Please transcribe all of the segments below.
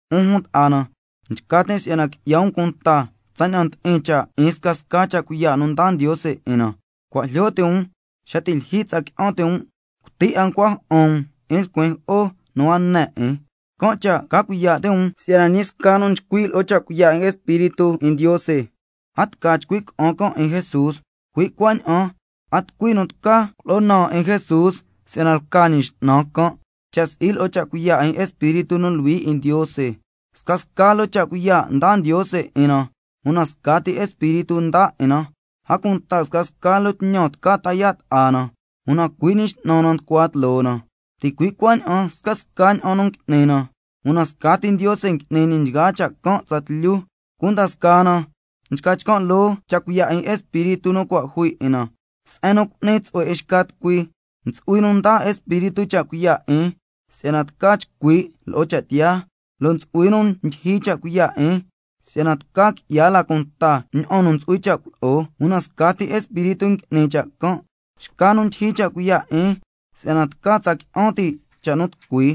'Un jun ta'a na, nchca tin' si'yana qui'ya um cunta tsaña'an ndi'in cha' 'in scasca cha' cuiya' nu ndaa Ndiose 'in na. Cua' jlyo ti' um xa ti' lyijyi tsa qui'an ti' um, cuti 'a ncua ja'an um 'in lcuin jo'o nu a ne 'in. Can' cha' ca cuiya' ti' um si'yana ñi sca nu nchcui' lo'o cha' cuiya' 'in Espíritu 'in Ndiose, a tca chcui' ca'an can' 'in Jesús, cui' cuaña'an a tucui nu tca culo'o naan 'in Jesús si'yana lca Ñi X'nan can', cha' si'i lo'o cha' cuiya' 'in Espíritu nu Luhui 'in Ndiose. Scasca loo cha' cuiya' ndaa Ndiose 'in na, una scati Espíritu ndaa 'in na. A cunta scasca loo tñan tca ta yaa' ta'a na, una cui' Ñi X'nan na nducua tloo na. Ticui' cuaña'an scasca ña'an nu ngui'ni na, una scati Ndiose ngui'ni ñi nchgaa cha' can' tsatlyu. Cunda scaa na nchca chcan' loo cha' cuiya' 'in Espíritu nu cua' jui 'in na, se'en nu cu'ni tsu'hue 'in xca tucui. Ntsu'hui nu ndaa Espíritu cha' cuiya' 'in si'yana tca chcui' lo'o cha' tiyaa, lo' ntsu'hui nu ndyijyi cha' cuiya' 'in si'yana tca qui'ya la cunta ña'an nu ntsu'hui cha' culo'o, una scati Espíritu ngui'ni cha' can'. Xca nu ndyijyi cha' cuiya' 'in si'yana tca tsa qui'an ti' cha' nu tucui,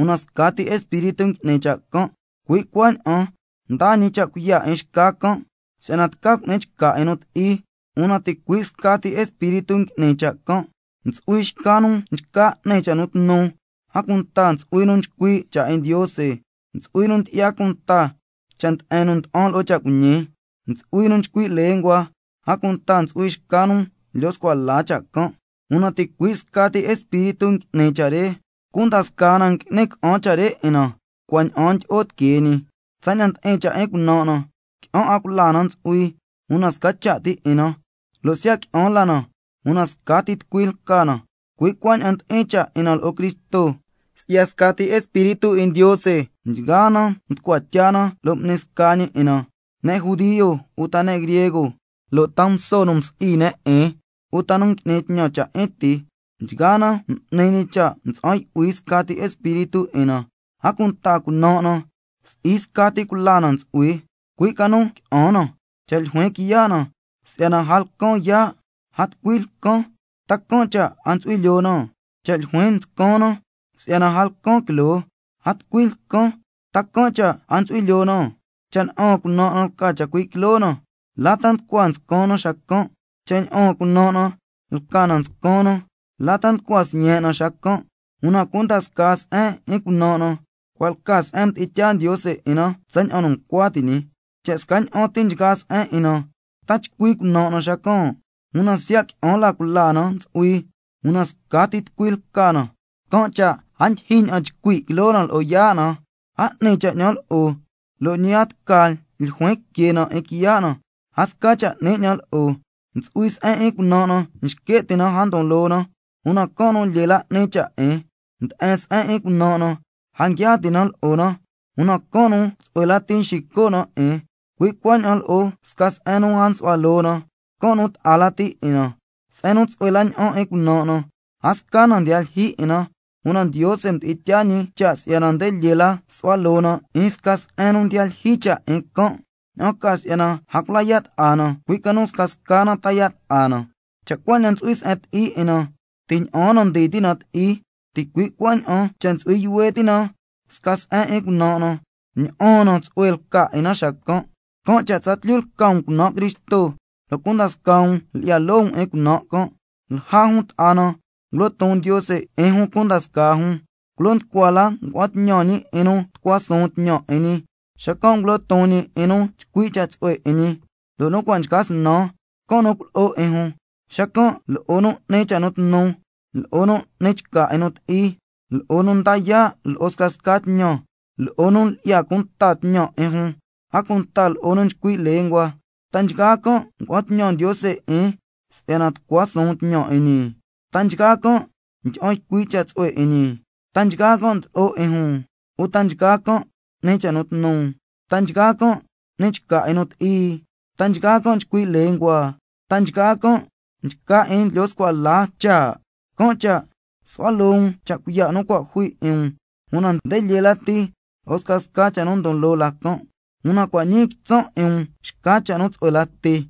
una scati Espíritu ngui'ni cha' can'. Cui' cuaña'an ndaa ñi cha' cuiya' 'in xca can' si'yana tca cu'ni chca 'in nu ti'i, una ticui' scati Espíritu ngui'ni cha' can'. Ntsu'hui xca nu nchca n'ni cha' nu tnu, a cunta ntsu'hui nu nchcui' cha' 'in Ndiose, ntsu'hui nu ndyi'ya cunta cha' nde'en nu nda'an lo'o cha' cuiñi, ntsu'hui nu nchcui' lenguas, a cunta ntsu'hui xca nu ndlyo scua la cha' can'. Una ticui' scati Espíritu ngui'ni nchgaa cha' re, cunda scaa na ngui'ni ca'an cha' re 'in na cua' ña'aan ndyi'o tiquee ñi. Tsaña'an ndi'in cha' 'in cunan' na, qui'an 'a cula na ntsu'hui, una sca cha' ti 'in na, lo' siya' qui'an la na, una scati tucui lca na, cui' cuaña'an ndi'in cha' 'in na lo'o Cristo. Si'ya scati Espíritu 'in Ndiose nchgaa na mducua tya na lo' m'ni sca ñi 'in na, ne' judio uta ne' griego, lo' ta nguso nu msi'i ne' 'in uta nu ngui'ni tñan cha' 'in ti, nchgaa na m'ni ñi cha' mtsa'an yu'hui scati Espíritu 'in na. A cunta, cunan' na si'i scati cula na ntsu'hui, cui' ca nu qui'an na. Cha' ljuin quiya' na: Si'yana a lcan yaa', a tucui lcan, ¿ta can' cha' a ntsu'hui lyoo na? Cha' ljuin nscan na: Si'yana a lcan quiloo, a tucui lcan. ¿Ta can' cha' a ntsu'hui lyoo na? Cha' ña'aan cunan' na lca na chacui' quiloo na, ¿la ta nducua nscan na xacan'? Cha' ña'aan cunan' na lca na nscan na, ¿la ta nducua siyen' na xacan'? Una cunda scaa se'en 'in cunan' na, cua' lca se'en mdi'in tyaa Ndiose 'in na tsaña'an nu ncua ti' ñi. Cha' scaña'an ti nchgaa se'en 'in na, ¿ta chcui cunan' na xacan'? Una siya' qui'an la cula na ntsu'hui, una scati tucui lca na. Can' cha' a ndyijyi ña'an chcui' quiloo na lo'o yaa' na: A 'ni cha' 'ñan lo'o. Lo' ñi a tca ljuin que na 'in quiya' na: A sca cha' 'ni 'ñan lo'o. Ntsu'hui se'en 'in cunan' na nxque' ti' na a ndon loo na, una can' nu lyee la 'ni cha' 'in. Nde'en se'en 'in cunan' na, a nguia ti' na lo'o na, una can' nu tsu'hue lati nxico' na 'in, cui' cuaña'an lo'o sca se'en nu a nsu'hua loo na, can' nu ta'a lati 'in na. Se'en nu tsu'hue la ña'an 'in cunan' na, a sca na ndiya lyijyi 'in na, una Ndiose mdi'in tyaa ñi cha' si'yana nde lyee la su'hua loo na 'in sca se'en nu ndiya lyijyi cha' 'in can', ña'an ca si'yana a cula ya' ta'a na, cui' ca nu scasca na ta yaa' ta'a na. Cha' cuaña'an ntsu'hui se'en ti'i 'in na, ti' ña'aan na ndii ti' na ti'i, ticui' cuaña'an cha' ntsu'hui yuhue ti' na sca se'en 'in cunan' na, ña'aan na tsu'hue lca 'in na xacan'. Can' cha' tsatlyu lca um cunan' Cristo, lo' cunda scaa um lyi'ya loo um 'in cunan' can'. Lja jun ta'a na ngulo ton Ndiose 'in jun cunda scaa jun, culo nducua la ngua'an tñan ñi 'in nu tucua suun tñan 'in ñi, xacan' ngulo ton ñi 'in nu chcui' cha' tsu'hue 'in ñi, lo' nu cua' nchca snan, can' nu culo'o 'in jun, xacan' lo'o nu n'ni cha' nu tnu, lo'o nu n'ni chca 'in nu ti'i, lo'o nu nda yaa' lo'o scasca tñan, lo'o nu lyi'ya cunta tñan 'in jun, a cunta lo'o nu nchcui' lenguas. ¿Ta nchgaa can' ngua'an tñan Ndiose 'in si'yana tucua suun tñan 'in ñi? ¿Ta nchgaa can' ndyi'an ycui' cha' tsu'hue 'in ñi? ¿Ta nchgaa can' ndlo'o 'in jun? ¿Uta nchgaa can' n'ni cha' nu tnu? ¿Ta nchgaa can' n'ni chca 'in nu ti'i? ¿Ta nchgaa can' nchcui' lenguas? ¿Ta nchgaa can' nchca 'in ndlyo scua la cha'? Can' cha' su'hua loo um cha' cuiya' nu cua' jui 'in um, una nde lyee lati lo'o scasca cha' nu ndon loo la can', una cua' ñii quitsan' 'in um xca cha' nu tsu'hue lati.